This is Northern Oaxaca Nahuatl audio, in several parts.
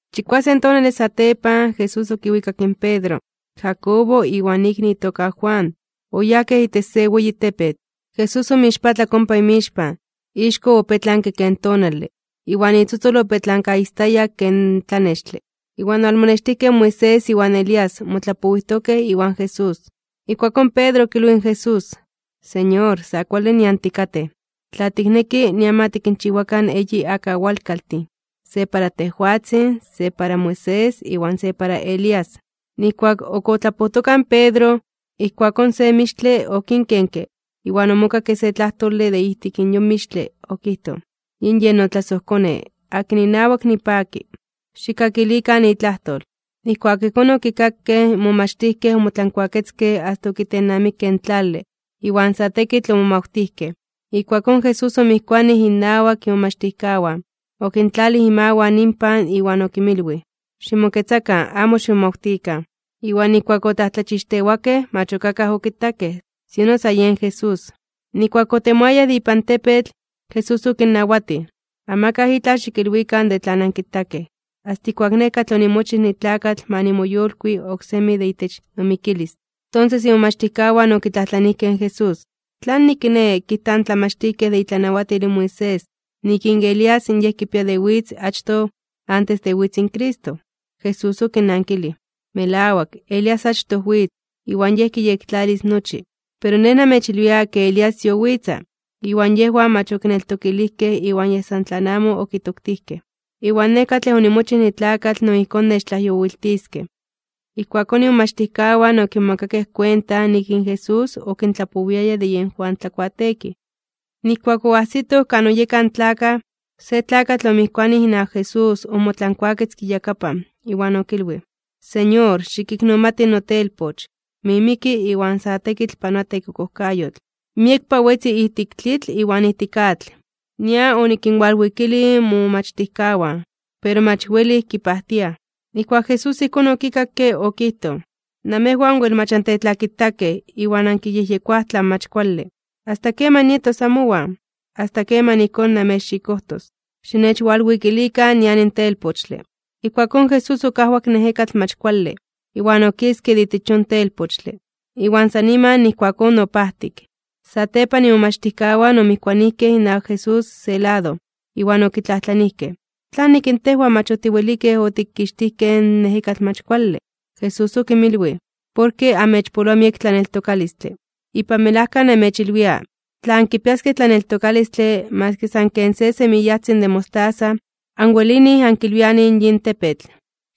Chikuasen tonale satepan, Jesús okiwikak in Pedro, in Jacobo iwan ikni itoka Juan, oyajkej itech se weyi tepetl. Jesús omoixpatlak ompa inmixpan. Ixko opetlanke ken tonale, iwan itzotzol opetlankaistayak ken tlanextle. Iwan owalmonextijkej in Moisés iwan Elías, motlapowijtokej iwan Jesús. Ijkuakón Pedro okilwij in Jesús: ―Señor, sa kuale nian tikatej. Tla tikneki, nian ma tikinchiwakan eyi akawalkaltin, se para tejwatzin, se para Moisés, iwan se para Elías. Nijkuak ok otlapojtoka in Pedro, ijkuakón se mixtle okinkenke iwan omokakke se tlajtole de ijtik yon mixtle, okijtoj: ―Yen yin notlasojKone, akin inawak nipaki. Xikkakilikan itlajtol. Nijkuak ijkón okikakej, in momachtijkej omotlankuaketzkej asta okitennamikej in tlale, iwan sa tekitl omomawtijkej. Ijkuakón Jesús omijkuanij innawak imomachtijkawan, okintlalij imawan inpan iwan okinmilwij: ―Ximoketzakan. Amo ximomawtikan. Iwan nijkuak otlajtlachixtewakej, mach ok akaj okitakej, sino sa yen Jesús. Nijkuak otemoayaj de ipan tepetl, Jesús okinnawatij: ―Amakaj itlaj xikilwikan de tlan ankitakej, asta ijkuak Nej katlej onimochij nitlakatl ma nimoyolkui oksemi de itech nomikilis. Tonses imomachtijkawan okitlajtlanijkej in Jesús: ―¿Tlanik kiné, kijtaj in tlamachtijkej de itlanawatil in Moisés nik in Elías yen kipia de witz achtoj antes de witz in Cristo? Jesús okinnankilij: ―Melawak, Elías achtoj witz, iwan yej kiyektlalis nochi. Pero Nej namechilwia ke Elías yowitza, iwan yejwan mach okineltokilijkej iwan yej san tlan amo okitoktijkej. Iwan Nej katlej onimochij nitlakatl no ijkón nechtlajyowiltiskej. Ijkuakón imomachtijkawan okimomakakej kuenta nik in Jesús okintlapowiaya de yen Juan Tlakuateekij. Nijkuak oajsitoj kan oyekaj in tlakaj, se tlakatl omijkuanij inawak Jesús omotlankuaketzke iyakapan, iwan okilwij: ―Señor, xikiknomati notelpoch, mimiki iwan sa tekitl panoa tekokojkayotl. Miekpa wetzi ijtik tlitl iwan ijtik atl. Nian onikinwalwikilij momomachtijkawan, pero mach welij kipajtiaj. Nijkuak Jesús ijkón okikakke, okijtoj: ―¡Namejwan wel mach antetlakitakej iwan ankiyejyekoaj tlan mach kuale! ¿Asta keman nietos amowan? ¿Asta keman ijkón namechxikojtos? Xinechwalwikilikan nian in telpochtle. Ijkuakón Jesús okajwak in ejekatl mach kuale, iwan okiske de itech yon telpochtle. Iwan san niman ijkuakón opajtik. Satepan imomachtijkawan omijkuanijkej inawak Jesús se lado, iwan okitlajtlanijkej: ―¿Tlanik in tejwan mach otiwelikej otikixtijkej in ejekatl mach kuale? Jesús okinmilwij: ―Porke amechpoloa miek tlaneltokalistle. Ipan melajka namechilwia, tla ankipiaskej tlaneltokalistle maski san ken se semiyajtzin de mostaza, anwelinij ankilwianij in yin tepetl: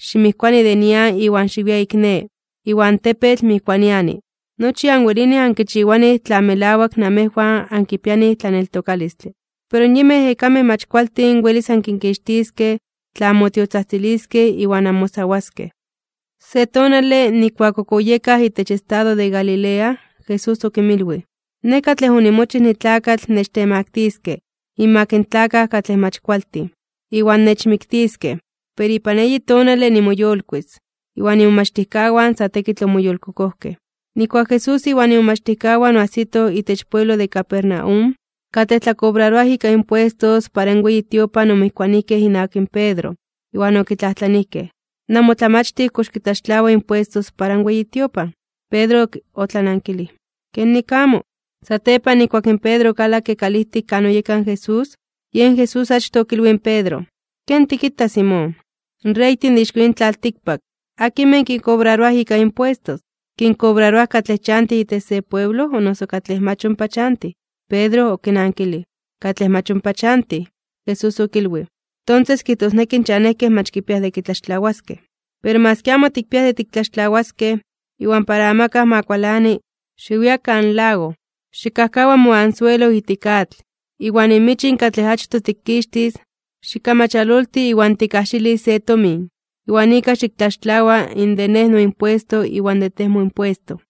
“Ximijkuani de nian iwan xiwia ik ne”, iwan in tepetl mijkuaniani. Nochi anwelinij ankichiwanij tla melawak namejwan ankipianij tlaneltokalistle. Pero in yinmej ejekamej mach kualtin welis ankinkixtiskej tla anmotiotzajtziliskej iwan anmosawaskej (onmayunaroskej). Se tonale, nijkuak ok oyekaj itech estado de Galilea, Jesús okinmilwij nik in Yej katlej omochij tlakatl kitemaktiskej (kitemaktiliskej) inmak in tlakaj katlej mach kualtin, iwan nechmiktiskej, pero ipan eyi tonale nimoyolkuis (nimoyolitis). Iwan imomachtijkawan sa tekitl omoyolkokojkej. Nijkuak Jesús iwan imomachtijkawan oajsitoj itech pueblo de Capernaum, katlej tlakobraroaj ika impuestos para in weyi tiopan omijkuanijkej inawak in Pedro, iwan okitlajtlanijkej: ―¿Namotlamachtij kox kitlaxtlawa impuesto para in weyi tiopan? Pedro otlanankilij: ―Kenik amo. Satepan nijkuak in Pedro okalakke kalijtik kan oyeka in Jesús, yen Jesús achtoj okilwij in Pedro: ―¿Ken tikita, Simón? In reytin de ixko yin tlaltikpak, ¿akinmej kinkobraroaj ika impuestos? ¿Kinkobraroaj katlej chantij itech se pueblo o noso katlej mach ompa chantij? Pedro okinankilij: ―Katlej mach ompa chantij. Jesús okilwij: ―Tonses kijtosneki in chanejkej mach kipiaj de kitlaxtlawaskej. Pero maski amo tikpiaj de tiktlaxtlawaskej, iwan para amakaj ma kualani, xiwia kan lago, xikkajkawa moanzuelo ijtik atl, iwan in michin katlej achtoj tikixtis, xikkamachalolti iwan tikkajxilis se tomin, iwan ika xiktlaxtlawa in de Nej noimpuesto iwan de tej moimpuesto.